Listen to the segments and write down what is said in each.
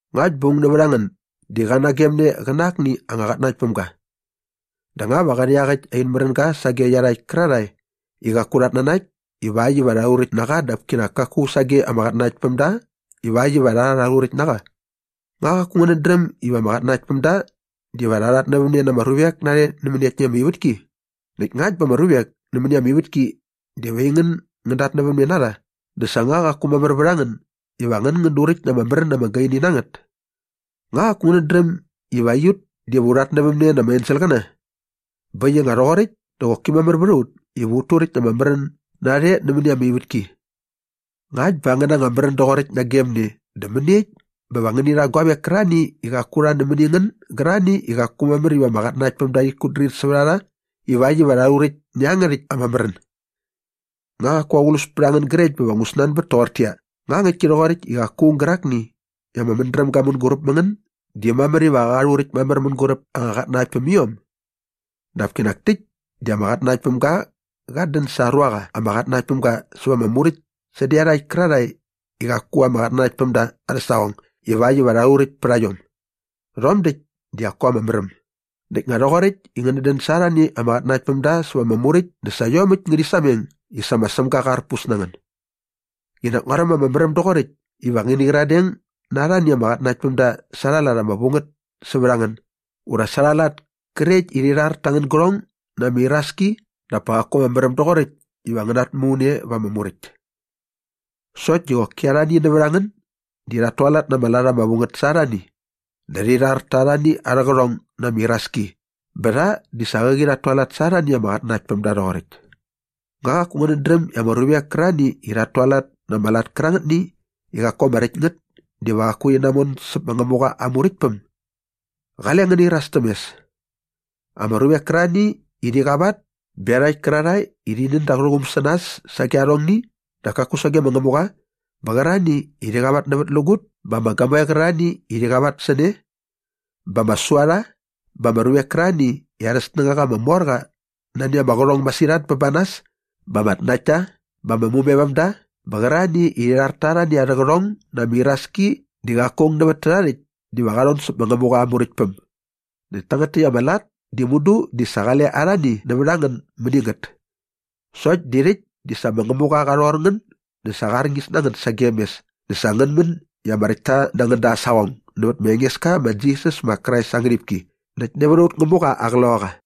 Ngakt bä aung nävät a ngän di qa nagemne qä na akni anga qatnanaktpämga dä nga va qä rha iaqäkt in märänga sage iarhakt kärarhae i qaku rhat nanakt ivakt iva rha rhuräkt na qa dap kinak kaku sage ama qatnanaktpämda ivakt iva rha rhuräkt na qa? Nga qaku ngänät dräm iva ama qatnanaktpämda diva rha rhatnävämne na ama ruvek narhe nämäni ama ivätki? Näkt ngakt bä ama ruvek nämäni ama ivätki diva aingän ngän datnävämne na rha dä sa nga qaku mamär vät a ngän iva ngän duräkt na ama märän ama gaini na ngät? Nga qaku ngänät dräm iva aiut diva u rhatnävämne na ama enselqäna? Bä äkt i nga rhoqoräkt dä qoki mamär vät a ut iva ut turäkt na ama märän narhe nämäni ama ivätki. Ngakt bä angän anga märän doqoräkt nagem ne dä mäniekt bä va ngäni rha guavek kärarhani i qaku rha nämäni ngän gärarhani i qaku mamär iva ama qatnanaktpämda rhit kutdrir sävät a rha ivakt iva rha rhuräkt nä iangärhäkt ama märän? Nga qaku aqlus pät a ngän grekt bä va ngu snanbät toqortäqyia, “Nga ngäktki rhoqoräkt i qaku aung gärakni i ama mädräm ga mänguräp mä ngän di mamär iva qa rhuräkt mamär mänguräp anga qatnanaktpämiom?” Dap kinak täkt di ama qatnanaktpämga qat dän sa aa ruaqa ama qatnanakt päm ga säva ama muräkt sädä iarhakt kärarhae i qaku ama qatnanakt päm da arhä saqong ivakt iva rha rhuräkt pät a iom. Rhom däkt di qaku ama märäm. Näkt nga rhoqoräkt i ngänät dän sa arhani ama qatnanaktpämda säva ama muräkt dä sa iomäkt ngärhi sameng i sa ma Sämga qa arpus na ngän. Qinak nguaräm ama märäm doqoräkt iva ngäni gyiradeng na arhani ama qatnanaktpämda sa arha lat ama vu ngät sävät ngän ura sa arha lat krekt iva rhi rhar ta angän gärhong na ama iraski dap pa qaku ama märäm doqoräkt iva ngän natmu ne va ama muräkt. Sokt di qoki arhani nävät a ngän di rhat tualat na ama lat ama vu ngät sa arhani dä rhi rhar ta arhani arhä qärhong na ama iraski bä rha di sa qäqi rhat tualat sa arhani ama qatnanaktpämda rhoqoräkt. Nga qaku ngänät dräm i ama ruvek kärarhani i rhat tualat na ama lat kärangätni i qaku ama räkt ngät diva qaku rhi namon säp ma Ngämuqa aa Muräktpäm? Qale ngän nairas täm mes. Ama ruvek kärarhani i rhi qavat bä iarhakt kärarhae i rhi nän da arhä quum sä nas sage arhongni dap kaku sage ma Ngämuqa bä qärarhani i rhi qavatnävätlägut bä ama gamoe qärarhani i rhi qavat sä ne bä ama suarha bä ama ruvek kärarhani i arhä snängaqa ama mor qa nani ama qärhong masirhat bä ba nas bä ama tnaktta bä ama mumevämda bä qärarhani i rhi rhar ta arhani arhä qärhong na ama iraski di qaku aung nävät tärha rhäkt diva qa rhon säp ma Ngämuqa aa Muräktpäm. Näkt tangät täkt ama lat di mudu di sa qale arhani nävät a ngän mäni ngät. Sokt di rhäkt di sa ma Ngämuqa qa rhor ngän dä sa qa arñis na ngän sagem mes näkt sa ngän män i ama räktta na ngän da aa saqong nävät ma Engeska ma Jisas ma Krais aa ngärhipki näkt nävät aut Ngämuqa aa Qloqaqa.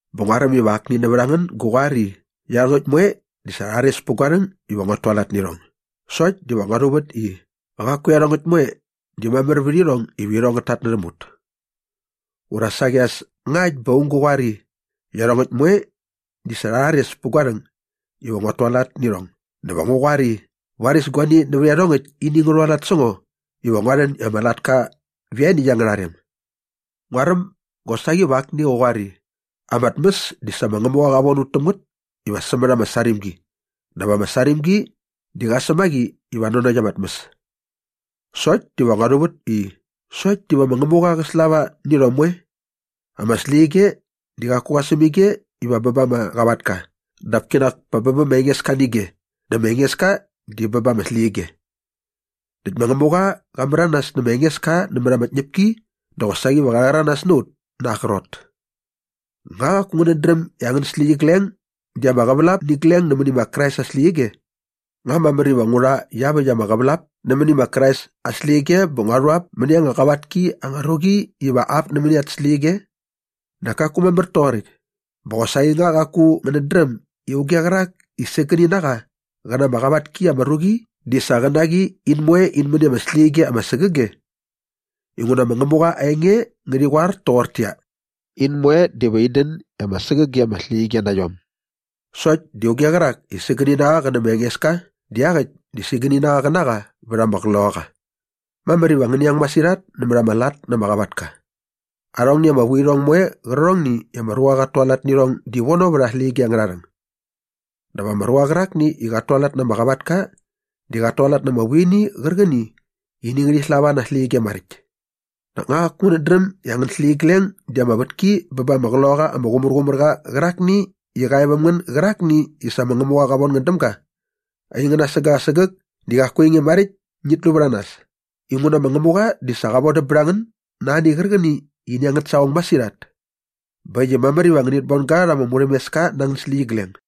Bä nguaräm iva akni nävät a ngän gä qoar i, “Iarhongäkt moe di sa rha rhares pät gua rhäng iva nguat tualat nä irhong” sokt diva ngua rhuvät i, “Qaku iarhongäkt moe di mamär vät irhong iva irhong ngät tatnärhäm ut.” Ura saqi as ngakt bä aung gä qoar i, “Iarhongäkt moe di sa rha rhares pät gua rhäng iva nguat tualat nä irhong” dä va ngu qoar i, “Varis guani nävät iarhongäkt ini ngä rhualat sä ngo iva ngua rhän i ama latka vä ianiäkt angärha rem.” Nguaräm gosaqi va akni qä qoar i, “Ama tmäs di sa ma Ngämuqa qa von ut täm ngät iva sämät ama sarimgi dap ama sarimgi di qa säm a qi iva nanokt ama tmäs.” Sokt diva ngua rhuvät i, “Sokt diva ma Ngämuqa qä slava nä irhom moe. Ama släqyige di qaku qa säm ige iva bä ba ama qavatka dap kinak pa bä bä ma Engeska nä ige dä ma Engeska di bä ba ama släqyige.” Näkt ma Ngämuqa qa märanas nä ma Engeska nämät ama tñäpki dä qosaqi va qa rhäranas na ut na aa qrot. Nga qaku ngänät dräm i angän släqyigleng di ama qävälap nä igleng nämäni ma Krais aa släqyige? Nga mamär iva ngu rha iaväkt ama qävälap nämäni ma Krais aa släqyige bä ngua rhu ap mäni anga qavat ki anga ruqi iva ap nämäni at släqyige? Nak kaku mamär toqoräkt! Bä qosaqi nga qaku ngänät dräm i auge qärak i sägäni na qa qä na ama qavat ki ama ruqi di sa qä na qi in moe in män i ama släqyige ama sägäge? Inguna ma Ngämuqa aa enge ngärhi qoar toqortäqyia, “In moe diva in dän i ama sägäge ama släqyige na iom.” Sokt di auge qärak i sägäni na qa qä nä ma Engeska di iaqäkt di sägäni na qa qä na qa vät ama qloqaqa. Mamär iva ngäni ang masirhat nämät ama lat na ama qavatka. Arhongni ama vuirhong moe qärqärhongni i ama ruqa qat tualat nä irhong di vono vät ama släqyige angärha rhäng. Dap ama ruqa qärakni i qat tualat na ama qavatka di qat tualat na ama vuini qärqäni i ini ngärhi slava na aa släqyige maräkt. Nak nga qaku ngänät dräm i angän släqyigleng di ama vätki bä ba ama Qloqaqa ama Qumärqumärqa qärakni i qa e väm ngän gärakni i sa ma Ngämuqa qa von ngän däm ga? Aingän asägäk asägäk di qaku ainge maräkt i ngit lu vät a nas inguna ma Ngämuqa di sa qa vodäm bät a ngän na ani qärqäni i ini angät saqong masirhat. Bä äkt i mamär iva ngänit bon ga rha ama murhämeska na angän släqyigleng.